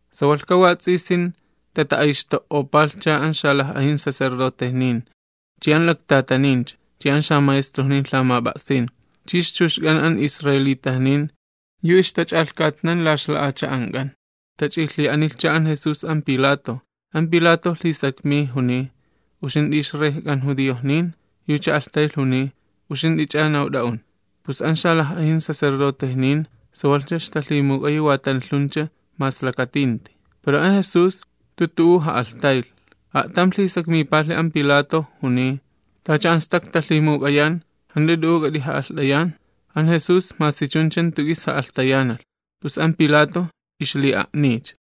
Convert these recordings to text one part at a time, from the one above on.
Sawalhka wats'isin, tata'ayxto'opalhcha an xalaj'ajin sacerdotejnin, chi an laktatanin, chi an xamaestrojnin lhamap'a'sin, chi ixchuxk'an an judiojnin yu ixtach'alhkatnan la ixla'acha'ank'an. Tach'ilhi'anilhcha an Jesús an Pilato. An Pilato lhisakmiy, juniy: ―¿Uxint'i ixrejk'an judiojnin? Yucha alhtaylh juniy: ―Uxint'ich'a nawt'a'un. Pus an xalaj'ajin sacerdotejnin ixta'alhtasuycha, pero an Jesús jantu tu'u ja'alhtaylh. A'tam lhisakmipalhi an Pilato juniy: ―Tacha an stak talhimuk'ayan, ¿jant'u t'u'u k'at'ija'alht'ayan? An Jesús masi chuncha jantu k'is ja'alhtayanalh, pus an Pilato ixli'a'niycha.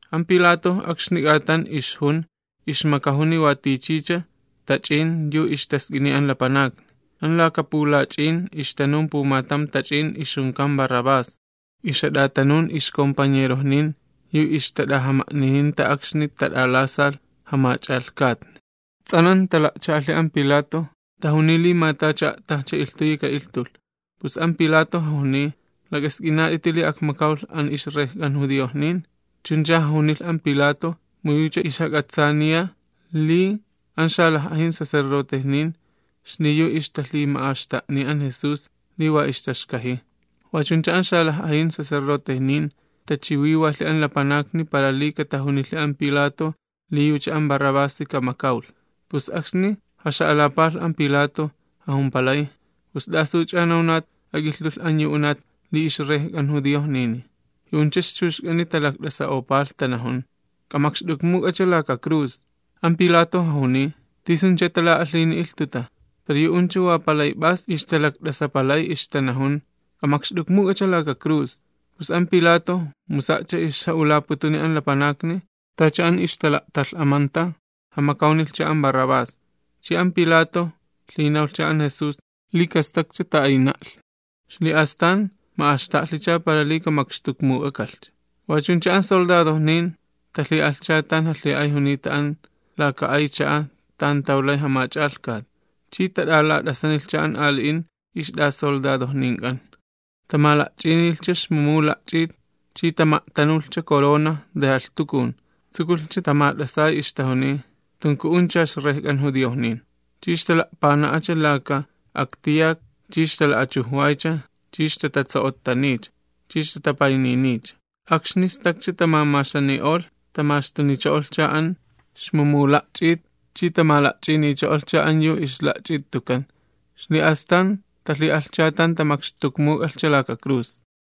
An Pilato akxni k'atan ixjun ixmakajuni watichicha tach'in yu ixtask'ini an lapanakni. An laka pulach'in ixtanun pumatam tach'in ixjunkan Barrabás, ixjat'atanun ixkompañerojnin yu ixtat'ajama'nininta akxni tat'alasalh jamach'alhkatni. Ts'anan tala'cha'alhi an Pilato, tajuniy li ma tacha a'tajcha ilhtuyi ka'ilhtulh. Pus an Pilato jajuniy: ―¿Lak'ask'inat'iti li akmakawlh an ixrejk'an judiojnin? Chuncha jajunilh an Pilato mu yucha ixjak'atsaaniya li an xalaj'ajin sacerdotejnin xliyu ixtalhima'axta'niy an Jesús li wa ixtaxkajiy. Wachuncha an xalaj'ajin sacerdotejnin tachiwiwalhi an lapanakni para li katajunilhi an Pilato li yucha an Barrabasi kamakawlh. Pus akxni jaxa'alapalh an Pilato, jajumpalay: ―¿Pus t'asuch'a nawnat ak'ilhtulh an yu unat li ixrejk'an judiojnini? Yu'uncha ixchuxk'ani talakt'asa'opalh tanajun: ―¡K'amakxt'ukmuk'acha laka cruz! An Pilato jajuniy: ―¿Tisuncha tala'alhini ilhtuta? Pero yu'uncha wa palay p'as ixtalakt'asapalay ixtanajun: ―¡K'amakxt'ukmuk'acha laka cruz! Pus an Pilato mu sa'cha ixja'ulaputuni an lapanakni tacha an ixtala'talh'amanta, jamakawnilhcha an Barrabás. Chi an Pilato lhinawlhcha an Jesús li kastakcha ta'ayna'lhi, xli'astan ma'axta'lhicha para li kamakxtukmuk'akalhcha. Wachuncha an soldadojnin talhi'alhcha tan jalhi'ay junita an laka palacio tan tawlay jamach'alhkat, chi tat'alat'asanilhcha an ali'in ixt'asoldadojnink'an. Tamala'ch'inilhcha xmumuw la'ch'it, chi tama'tanulhcha corona de jalhtukun. Tsukulhcha tamat'asay ixtajuniy: ―¡K'ajama'alht'axt'uncha ixrejk'an judiojnin! Chi ixtala'pana'acha laka aktiyak chi ixtala'achujwaycha chi ixtatatso'ottaniycha, chi ixtatapayniniycha. Akxni stakcha tamamaxani'olh, tamaxtunicho'olhcha an xmumuw la'ch'it chi tamala'ch'inicho'olhcha an yu ixla'ch'it tukan. Xli'astan talhi'alhcha tan tamakxtukmuk'alhcha laka cruz.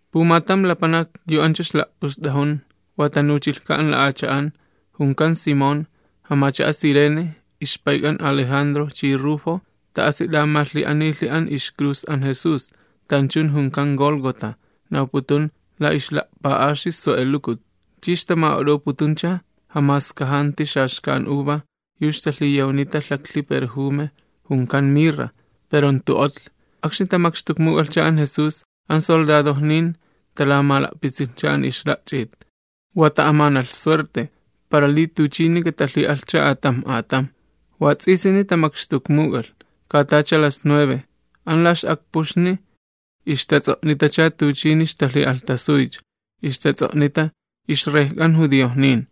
Pumatam lapanak yu ancha ixla'pust'ajun, wa tanuchilhka an la'acha'an, junkan Simón, jamacha'a Cirene, ixpayk'an Alejandro chi Rufo, ta'asi t'amalhi'anilhi an ixcruz an Jesús, tanchun junkan Gólgota, nawputun la Ixla'pa'axi Sue'elukut. Chi ixtama'ot'oputuncha jamaskajanti xaxkan uva yu ixtalhiyawnita mirra, pero jantu otlhi. Akxni tamakxtukmuk'alhcha an Jesús, an soldadojnin talamala'pitsilhcha an ixla'ch'it, wa ta'amanalh suerte, para li tuchini katalhi'alhcha atamj atamj. Wats'isini tamakxtukmuk'alh, katacha las nueve. An la ix'akpuxni ixtats'o'nitacha tuchini talhima'nilhcha, ixtats'o'nita: “IxRejk'an judiojnin”.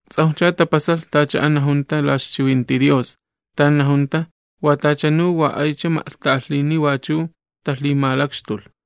Ts'awjcha tapasalh tacha an najunta la ixchiwinti Dios, tan najunta: “Wa tachanu wa aycha ma'lhta'alhini wachu talhimalakxtulh.”]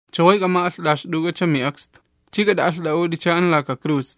¡Chaway k'ama'alht'axt'uk'acha mi'akstu, ch'i k'at'a'alht'a'ut'icha an laka cruz!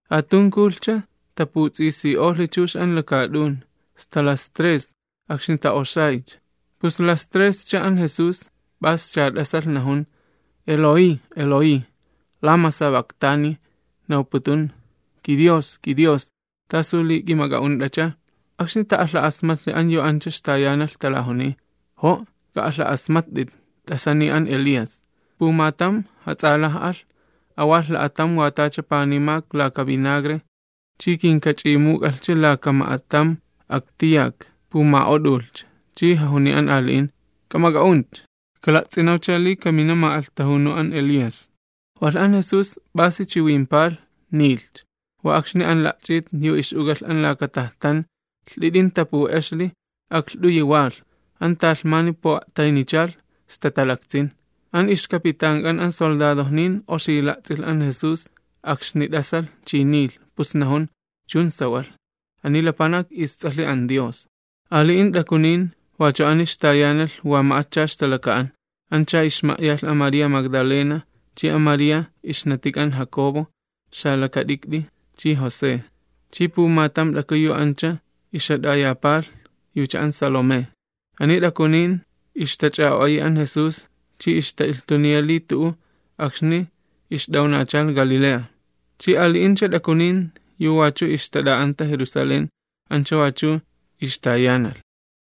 Atunkulhcha, taputs'isi'olhi chux an lakaat'un, sta las tres akxni ta'oxaycha. Pus las trescha an Jesús, p'asi chiwinilh, najun: ―Eloí, Eloí, ¿lama sabactani? ―nawputun: KiDios, kiDios, ¿t'asu li k'imak'a'unt'acha? Akxni ta'alha'asmatlhi an yu ancha ixtayanalh, talajuniy: ―¡Jo'! T'asaniy an Elías. Pumatam jats'alaj'alh, mala'ch'uch'uwalh la'atam wa tacha panimak laka vinagre, chi kinkach'imuk'alhcha ma'atam k'iw, para li kapuma'ot'ulhcha, chi jajuniy an ali'in: ―K'amak'a'unt'itcha, kala'ts'inawcha li kamina ma'alhtajunu an Elías. Walh an Jesús p'asi chiwimpalh, nilhcha. Wa akxni an la'ch'it yu ix'uk'alh an laka tajtan lht'it'in tapu'exli, aklht'uyi walh, an talhmani pu'a'taynichalh sta talaktsin. An ixkapitank'an an soldadojnin oxi la'ts'ilh an Jesús akxni t'asalh chi niilh, pus najun: ―Chun sawalh, ani lapanak isTs'alhi an Dios. Ali'in t'akunin wachu ani ixtayanalh wa ma'atcha ixtalaka'an. Ancha ixma'yalh an María Magdalena, chi an María yu ixnatik'an José chi Jacobo xalakat'ikt'i, chi pumatam t'aku yu ancha ixjat'ayapalh yucha an Salomé. Ani t'akunin ixtach'a'o'ayi an Jesús chi ixta'a'tayjuy akxni ixt'awnachalh Galilea, chi ali'incha t'akunin yu wachu ixtat'a'anta Jerusalén ancha wachu ixtayanalh.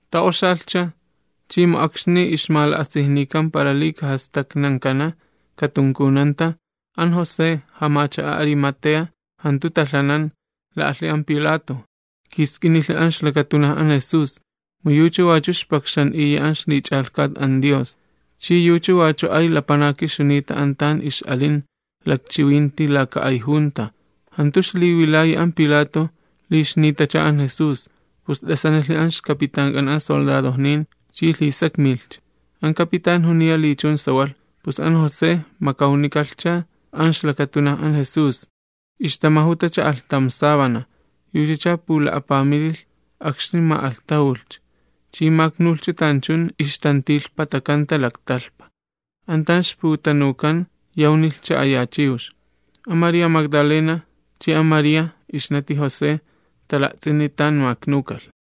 Tats'isilhcha, chi mu akxni ixmala'asijnikan para li kajastaknankana katunkunanta, an José, jamacha'a Arimatea jantu talhanan, la'alhi an Pilato, kiisk'inilhi an ixlakatunaj an Jesús. Mu yucha wachu ixpakxan'iya an ixlich'alhkat Dios, chi yucha wachu ay lapanaki ixjunita an tan ix'alin lakchiwinti laka ay junta. Jantu ixliwilayi an pilato li ixnitacha an Jesús, pus t'asanilhi an ixcapitank'an soldadojnin chi lhisakmilhcha. An capitán juniya li chun sawalh, pus an José makawnikalhcha an ixlakatunaj an Jesús. Ixtamajutacha alhtam sábana, yuchacha pula'apamililh akxni ma'alhtajulhcha, chi maknulhcha tanchun ixtantilhpatakanta laktalhpa, an tan ixputanukan yawnilhcha aya chiwx. An María Magdalena chi an María ixnati José tala'ts'ini tan maknukalh.